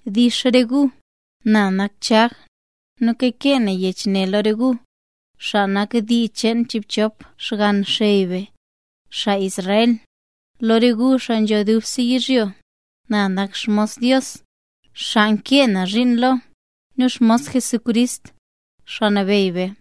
Dix re gu. Na nak Chag, nu kakee na yech ne lo re gu, xaa nak dii cheen chiibchop xgann xey be, xaa Israel, lo re gu xaa nzho dubse yizhyo. Na nak xmos Dios, xaa nkee na zhiin lo, nu xmos Jesucrist, Xaa Nabeyy be.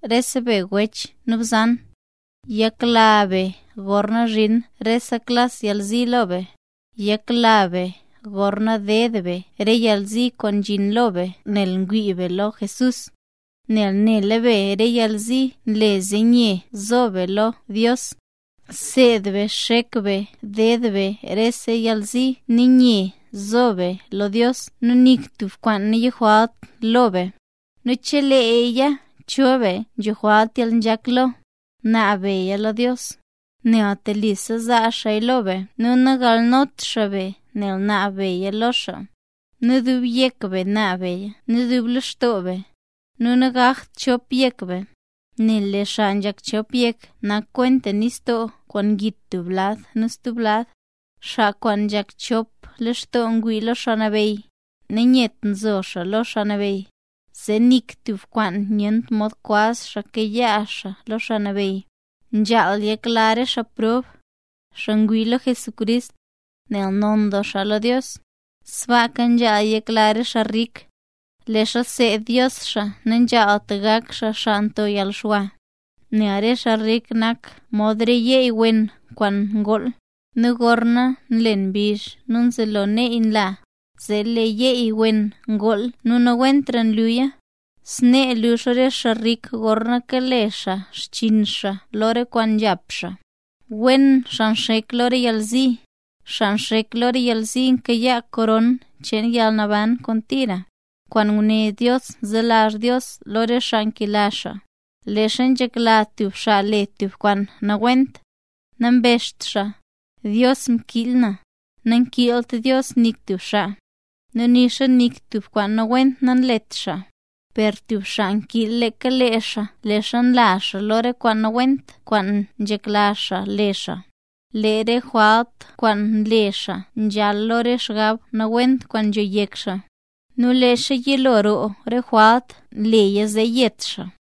Rese be wech nu bzan, yakla be gorna zhin reta klas yalzi lo be. Yakla be gorna nded be re yalzi kwaan nzhin lo be nel ngwii be lo Jesús, nel nela be re yalzi nle zee nye nzo be lo Dios. Bseed be xek be ded be rese yalzi nu nye zo be lo Dios nu nik tub kwaan nayojwalt lo be. Nu cheleeya cho be nzho jwalt yalnzhak lo, gunaab beya lo Dios, nel telisa zaa xaaya lo be nu nagalnot xaa be nel ngunaab beya lo xaa. Per dub yek be naab beya nu dub lextoo be, nu nagakt chop yek be. Nel lee xaa nzhak chop yek, nak kwenta nistoo kwaan ngit tub lad nu stub lad. Xaa kwaan nzhak chop lextoo ngwii xaa lo Xaa Nabeyy, nanyet nzo xaa lo Xaa Nabeyy, zee nik tub kwaan nyent mod kwaz xaa kayaa xaa lo Xaa Nabeyy. Nzhaal yakla re xaa prob, xaa ngwii lo Jesucrist, nel non doo xaa lo Dios. Sbaaka nzhaal yakla re xaa rik, leezha nseed Dios xaa nanzhaalt gak xaa xaa nto yalxwa. Nel re xaa rik nak mod re yeey wen kwaan ngool; nu gorna nlen mbizh nu nzelo neey nla, zee lee yeey wen ngool nu nawentra luya. Snee lux re xaa rik gorna kale xaa xchiin xaa lo re kwaan nzhap xaa. Wen xaa nxek lo re yalzi. Xaa nxek lo re yalzi kayaa koron cheen yalnaban kwaan tira, kwaan nguné Dios selazh Dios lo re xaa nkela xaa. Leezha nzhekla tub xaa le tub kwaan nawent, nambezht xaa: “Dios mkiil na”. Nel nankiilt Dios nik tub xaa, nu nixa nik tub kwaan nawent nanlet xaa. Per tub xaa nkiil leeka lee xaa leezha nla xaa lo re kwaan nawent kwaan nzhekla xaa le xaa. Nu lee re jwalt kwaan nle xaa nzhal lo re xgab nawent kwaan nzho yek xaa. Nu leezha yilo roo re jwalt, leeya nle zee yet xaa.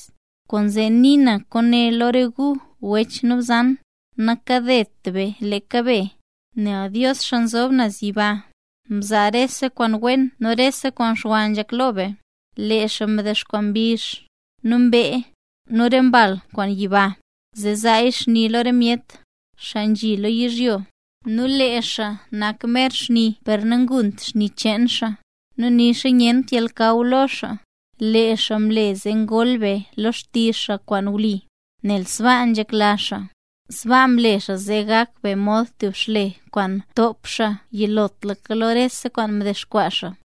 Kwaanzee nii na lo re gu wech nu bzan, nakadet be leeka be. Nel Dios xaa nzob naz yiba, nzaa rese kwaan wen nu rese kwaan xwa nzhak lo re be. Lee xaa mdexkwaa mbizh, nu mbee, nu re mbal ma yiba, zee zaa ma xni lo re myet, xaa nzhi lo yizhyo. Nu lee xaa nak mer xni per nangunt xni cheen xaa, nu nixa nyent yalnakaw lo xaa. Lee xaa mle zee ngol be lo xtizh xaa kwaan wli, nel sbaa nzhekla xaa. Sbaa mle xaa zee gak be mod tub xle kwaan ntop xaa yilotlaka lo rese kwaan mdexkwaa xaa.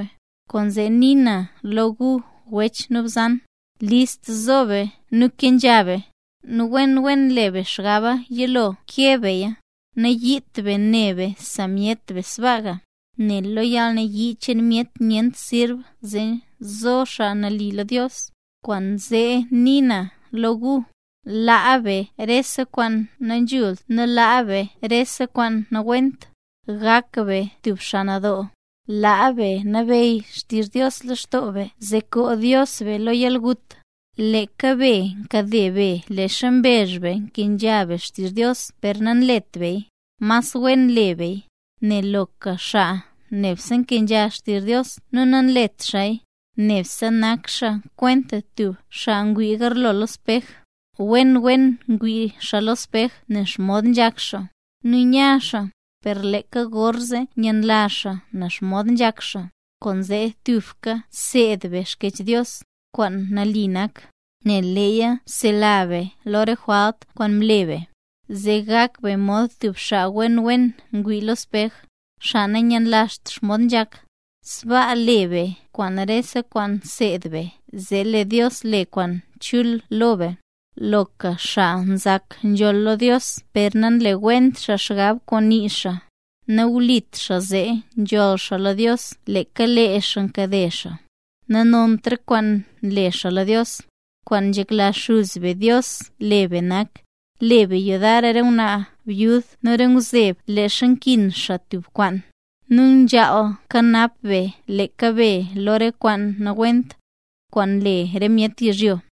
Kwaanzee nii na lo gu wech nu bzan, list zo be kenzha be, nu wen wen le be xgaba yilo keb beya, nayiit be ne be re myet sbaaga. Nel lee yalnayii cheen myet nyent mod zo xaa nali lo Dios. Kwaanzee nii na lo gu: Laa be rese kwaan nanzhult nu laa be rese kwaan nawent. Gak be tub xaa nadoo, laa be nabeyy xtizh Dios lextoo be zee koo Dios be lo yalgut. Leeka be nkade be leezha mbezh be nkenzha be xtizh Dios per nanlet beya; mas wen le beya. Nel loka xaa nebse nkenzha xtizh Dios nu nanlet xaaya, nebse nak xaa kwenta tub xaa ngwii garlo lo spej. Wen wen ngwii xaa lo spej nen xomod nzhak xaa, nu nya xaa; per leeka gorzee myenlazh xaa nen xomod nzhak xaa. Kwaanzee tubka seed be Xkyech Dios, kwaan nali nak, nel leeya nsela be lo re jwalt kwaan mle be. Zee gak be mod tub xaa wen wen ngwii lo spej, xaa nanyenlazht xomod nzhak. Sbaa le be rese kwaan nseed be zee lee Dios le kwaan chul lo be. Loka xaa nzak nzhool lo Dios per nanlewent xaa xgab kwaan nii xaa, nawlit xaa zee nzhool xaa lo Dios, leeka lee xaa nkade xaa, zee nanont re kwaan nle xaa lo Dios. Kwaan nzhekla xuz be Dios le be nak: Le be yudar re ngwnaa byud nu re ngwzeb leezha nkin xaa tub kwaan, nu nzhaal kanap be leeka be lo re kwaan nawent, kwaan nle re myet yizhyo.